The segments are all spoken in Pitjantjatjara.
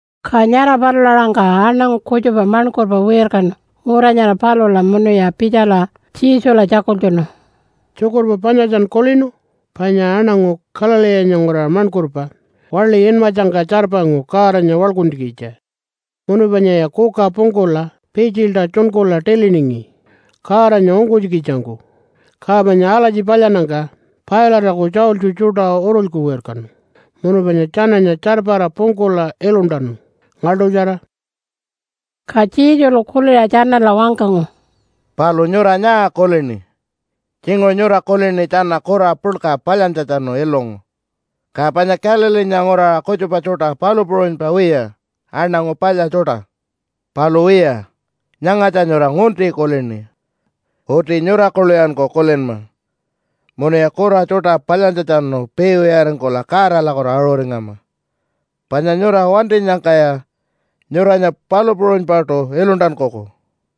Ka nyara palula-aṟangka aṉangu kutjupa maṉkurpa wirkanu ngura nyara palula munuya pitjala Jesula tjakultjunu, “Tjukurpa panyatjan kulinu? Panya aṉangu Galileenya nguraṟa maṉkurpa waḻi inmatjangka tjarpangu Godanya waḻkuntjikitja. Munu panyaya kuka pungkula pitjilta tjunkula tiliningi Godanya ungkunytjikitjangku. Ka panya alatji palyannyangka Pilate-aku tjaultji tjuṯa urulyku wirkanu munu panya tjananya tjarpara pungkula iluntanu, ngaḻṯutjara.” Ka Jesulu kuliṟa tjanala wangkangu, “Palu nyura nyaa kulini? Tjinguṟu nyura kulini tjana kura puḻka palyantjatjanu ilungu, ka panya Galileenya nguraṟa kutjupa tjuṯa palu puṟunypa wiya aṉangu palya tjuṯa. Palu wiya, nyangatja nyura ngunti kulini. Uti nyura kuḻuyanku kulinma, munuya kura tjuṯa palyantjatjanu piiwiyaringkula Godalakutu aṟuringama! Panya nyura wantinyangkaya nyuranya palu puṟunypaṯu iluntankuku.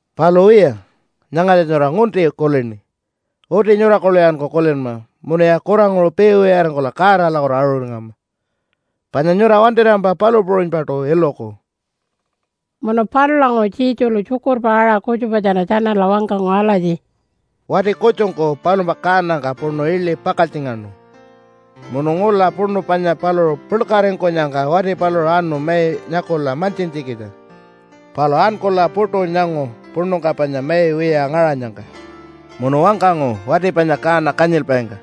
Palu wiya, nyangatja nyura ngunti kulini. Uti nyura kuḻuyanku kulinma, munuya kuranguṟu piiwiyaringkula Godalakutu aṟuringama! Panya nyura wantirampa palu puṟunypaṯu iluku.” Munu palulanguṟu Jesulu tjukurpa aṟa kutjupatjara tjanala wangkangu alatji, “Wati kutjungku palumpa kaanangka puṉu iḻi pakaltjingaṉu, munu ngula puṉu panya paluṟu puḻkaringkunyangka wati paluṟu anu mai nyakula mantjintjikitja. Palu ankula puṯu nyangu puṉungka panya mai wiya ngaṟanyangka. Munu wangkangu wati panya kaana kanyilpaingka,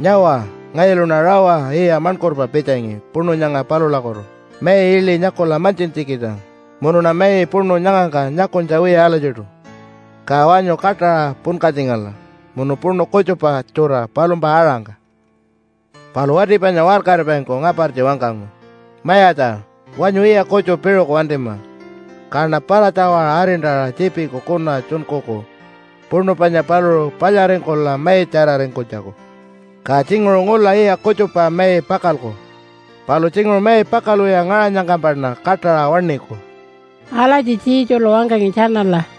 ‘Nyawa, ngayuluṉa rawa yiya maṉkurpa pitjangi puṉu nyanga palulakutu mai iḻi nyakula mantjintjikitja munuṉa mai puṉu nyangangka nyakunytja wiya alatjiṯu. Ka wanyu kaṯaṟa punkatjingala, munu puṉu kutjupa tjura palumpa aṟangka.’ “Palu wati panya waṟkaripaingku ngapartji wangkangu, ‘Mayatja, wanyu yiya kutju piṟuku wantima, kaṉa para-tjawaṟa arintaṟa tjiipiku kuna tjunkuku puṉu panya paluṟu palyaringkula maitjararingkunytjaku. Ka tjinguṟu ngula yiya kutjupa mai pakalku. Palu tjinguṟu mai pakalwiya ngaṟanyangkampaṉa kaṯaṟa waṉiku.’” Alatji Jesulu wangkangi tjanala.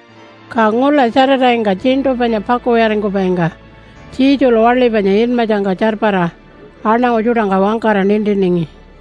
Ka ngula Saturday-ngka tjiṉṯu panya pakuwiyaringkupaingka Jesulu waḻi panya inmatjangka tjarpara aṉangu tjuṯangka wangkara nintiningi.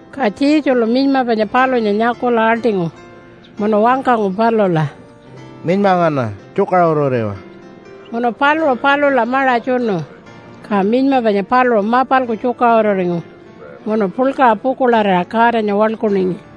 Ka Jesulu minyma panya palunya nyakula aḻṯingu munu wangkangu palula, “Minyma ngana, tjukaṟururiwa!” Munu paluṟu palula maṟa tjunu, ka minyma panya paluṟu mapalku tjukaṟururingu munu puḻkaṟa pukuḻarira Godanya waḻkuningi.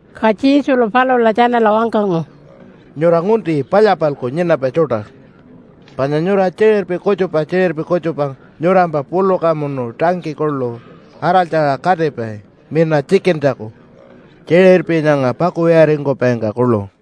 Ka Jesulu palula tjanala wangkangu, “Nyura ngunti palya-palku nyinapai tjuṯa. Panya nyura tjiṟirpi kutjupa tjiṟirpi kutjupa nyurampa puluka munu tangkiyi kuḻu araltjara katipai mina tjikintjaku tjiṟirpi nyanga pakuwiyaringkupaingka kuḻu.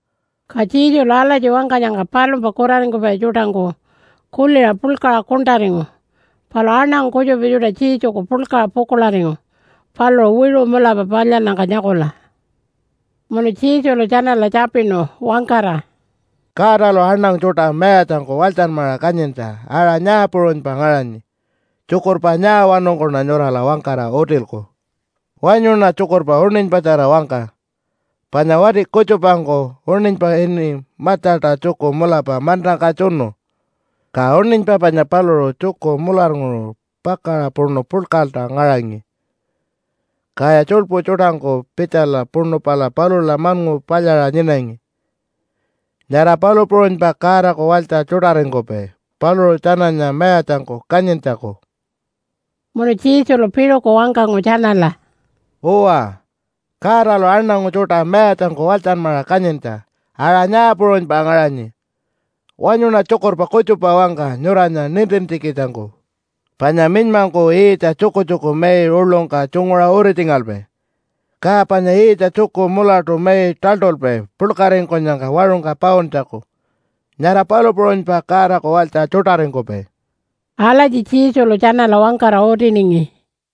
Ka Jesulu alatji wangkanyangka palumpa kuraringkupai tjuṯangku kuliṟa puḻkaṟa kuṉṯaringu, palu aṉangu kutjupa tjuṯa Jesuku puḻkaṟa pukuḻaringu paluṟu wiṟu mulapa palyannyangka nyakula. Munu Jesulu tjanala tjapinu wangkara, “Godalu aṉangu tjuṯa mayatjangku walytjanmaṟa kanyintja aṟa nyaa puṟunypa ngaṟanyi? Tjukurpa nyaawanungkuṉa nyurala wangkara utilku? Wanyuṉa tjukurpa uṉinypatjara wangka. Panya wati kutjupangku uṉinypa ini matjata tjuku mulapa mantangka tjunu, ka uṉinypa panya paluṟu tjuku mularnguṟu pakaṟa puṉu puḻkalta ngaṟangi, kaya tjuḻpu tjuṯangku pitjala puṉu pala palula maṉngu palyaṟa nyinangi. Nyara palu puṟunypa Godaku walytja tjuṯaringkupai paluṟu tjananya mayatjangku kanyintjaku.” Munu Jesulu piṟuku wangkangu tjanala, “Uwa, Godalu aṉangu tjuṯa mayatjangku walytjanmaṟa kanyintja aṟa nyaa puṟunypa ngaṟanyi? Wanyuṉa tjukurpa kutjupa wangka nyuranya nintintjikitjangku. Panya minymangku yiitja tjukutjuku mai uḻungka tjunguṟa uritjingalpai, ka panya yiitja tjuku mulatu mai taḻṯulpai puḻkaringkunyangka waṟungka pauntjaku. Nyara palu puṟunypa Godaku walytja tjuṯaringkupai.” Alatji Jesulu tjanala wangkara utiningi.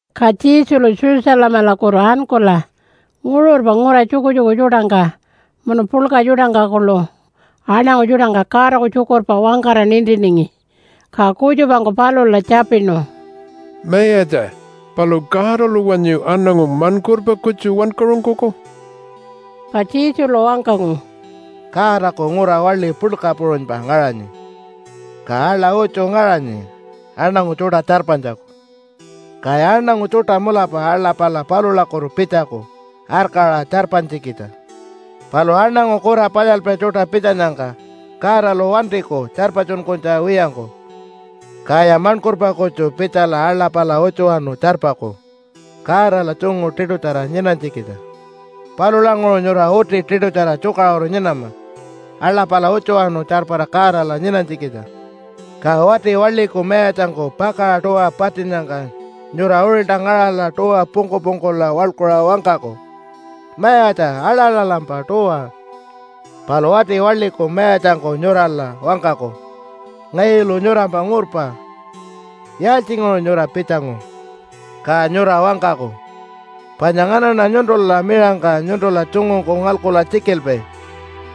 Ka Jesulu Jerusalemalakutu ankula nguṟurpa ngura tjukutjuku tjuṯangka munu puḻka tjuṯangka kuḻu aṉangu tjuṯangka Godaku tjukurpa wangkara nintiningi. Ka kutjupangku palula tjapinu, “Mayatja, palu Godalu wanyu aṉangu maṉkurpa kutju wankaṟunkuku?” Ka Jesulu wangkangu, “Godaku ngura waḻi puḻka puṟunypa ngaṟanyi, ka aḻa utju ngaṟanyi aṉangu tjuṯa tjarpanytjaku. Kaya aṉangu tjuṯa mulapa aḻa pala palulakutu pitjaku arkaṟa tjarpanytjikitja. Palu aṉangu kura palyalpai tjuṯa pitjanyangka Godalu wantiku tjarpatjunkunytja wiyangku. Kaya maṉkurpa kutju pitjala aḻa pala utjuwanu tjarpaku Godala tjungu tiṯutjara nyinanytjikitja. Palulanguṟu nyura uti tiṯutjara tjukaṟuru nyinama aḻa pala utjuwanu tjarpara Godala nyinanytjikitja. Ka wati waḻiku mayatjangku pakaṟa tuwa patinnyangka nyura uṟilta ngaṟala tuwa pungku-pungkula waḻkuṟa wangkaku, ‘Mayatja, aḻalalampa tuwa!’ Palu wati waḻiku mayatjangku nyurala wangkaku, ‘Ngayulu nyurampa ngurpa. Yaaltjinguṟu nyura pitjangu?’ Ka nyura wangkaku, ‘Panya nganaṉa nyuntula miṟangka nyuntula tjungungku ngalkula tjikilpai,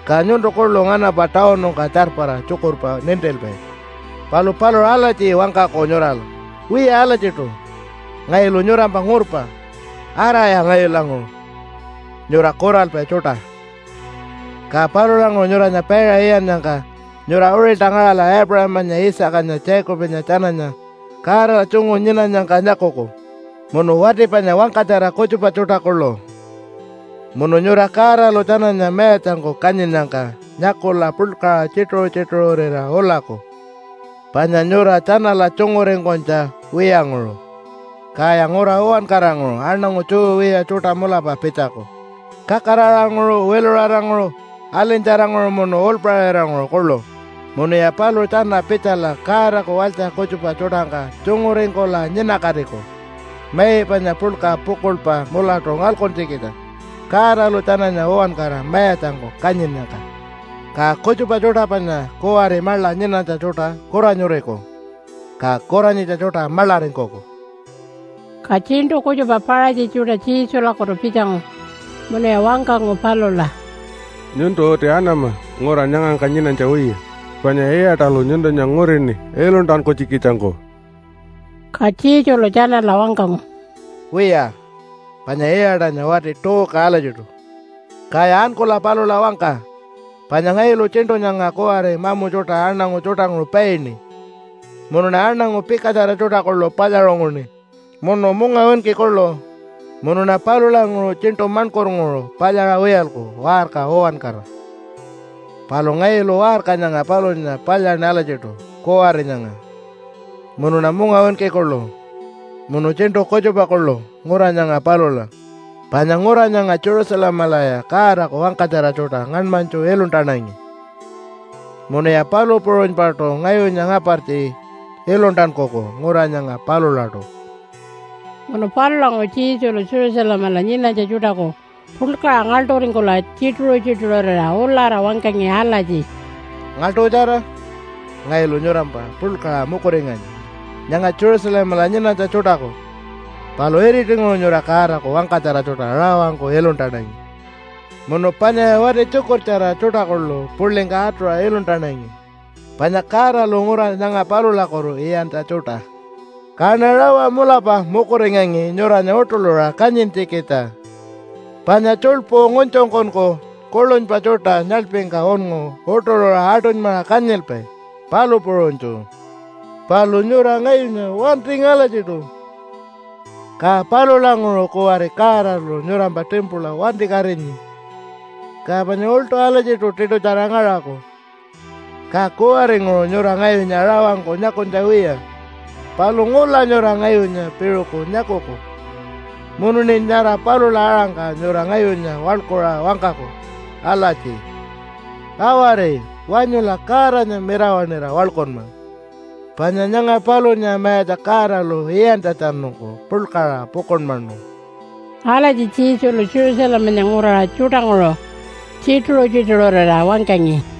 ka nyuntu kuḻu nganampa tawunungka tjarpara tjukurpa nintilpai.’ Palu paluṟu alatji wangkaku nyurala, ‘Wiya alatjiṯu, ngayulu nyurampa ngurpa. Araya ngayulanguṟu. Nyura kuralpai tjuṯa.’ “Ka palulanguṟu nyuranya paiṟa iyannyangka nyura uṟilta ngaṟala Aipuṟamanya, Isaacanya, Jacobanya tjananya Godala tjungu nyinanyangka nyakuku munu wati panya wangkatjara kutjupa tjuṯa kuḻu. Munu nyura Godalu tjananya mayatjangku kanyinnyangka nyakula puḻkaṟa tjituṟu-tjituṟurira ulaku panya nyura tjanala tjunguringkunytja wiyanguṟu. Kaya ngura uwankaranguṟu aṉangu Jew wiya tjuṯa mulapa pitjaku kakaraṟanguṟu wiluṟaranguṟu alinytjaranguṟu munu uḻpaṟiranguṟu kuḻu, munuya paluṟu tjana pitjala Godaku walytja kutjupa tjuṯangka tjunguringkula nyinakatiku mai panya puḻka pukuḻpa mulatu ngalkuntjikitja Godalu tjananya uwankara mayatjangku kanyinnyangka. Ka kutjupa tjuṯa panya kuwari maḻa nyinanytja tjuṯa kuranyuriku, ka kuranyitja tjuṯa maḻaringkuku.” Ka tjiṉṯu kutjupa Paṟatji tjuṯa Jesulakutu pitjangu munuya wangkangu palula, “Nyuntu uti anama ngura nyangangka nyinanytja wiya, panya Iṟatalu nyuntunya ngurini iluntankunytjikitjangku.” Ka Jesulu tjanala wangkangu, “Wiya panya Iṟatanya wati tuuka alatjiṯu. Kaya ankula palula wangka panya ngayulu tjiṉṯu nyanga kuwari mamu tjuṯa aṉangu tjuṯanguṟu paini, munuṉa aṉangu pikatjara tjuṯa kuḻu palyaṟunguṉi munu mungawinki kuḻu, munuṉa palulanguṟu tjiṉṯu maṉkurnguṟu palyaṟa wiyalku waṟka uwankara. “Palu ngayulu waṟka nyanga palunya palyaṉi alatjiṯu kuwari nyanga, munuṉa mungawinki kuḻu, munu tjiṉṯu kutjupa kuḻu ngura nyanga palula. Panya ngura nyanga Jerusalemalaya Godaku wangkatjara tjuṯa ngaṉmanytju iluntanangi, munuya palu puṟunypaṯu ngayunya ngapartji iluntankuku ngura nyanga palulaṯu.” Munu palulanguṟu Jesulu Jerusalemala nyinanytja tjuṯaku puḻkaṟa ngaḻṯuringkula tjituṟu-tjituṟurira ulara wangkangi alatji, “Ngaḻṯutjara! Ngayulu nyurampa puḻkaṟa mukuringanyi nyanga Jerusalemala nyinanytja tjuṯaku. Palu iritinguṟu nyura Godaku wangkatjara tjuṯa rawangku iluntanangi munu panyaya wati tjukurtjara tjuṯa kuḻu puḻingka atuṟa iluntanangi panya Godalu ngura nyanga palulakutu iyantja tjuṯa. Kaṉa rawa mulapa mukuringangi nyuranya uṯuḻuṟa kanyintjikitja, panya tjuḻpu ngunytjungkunku kuḻunypa tjuṯa nyaḻpingka unngu uṯuḻuṟa aṯunymaṟa kanyilpai, palu puṟunytju. Palu nyura ngayunya wantingi alatjiṯu. “Ka palulanguṟu kuwari Godalu nyurampa timpula wantikatinyi, ka panya uḻṯu alatjiṯu tiṯutjara ngaṟaku. Ka kuwaringuṟu nyura ngayunya rawangku nyakunytja wiya. Palu ngula nyura ngayunya piṟuku nyakuku munuṉi nyara palula aṟangka nyura ngayunya waḻkuṟa wangkaku alatji, ‘Awari! Wanyula Godanya mirawaṉira waḻkunma, panya nyanga palunya Mayatja Godalu iyantjatjanungku puḻkaṟa pukuḻmanu.’” Alatji Jesulu Jerusalemanya nguraṟa tjuṯanguṟu tjituṟu-tjituṟurira wangkangi.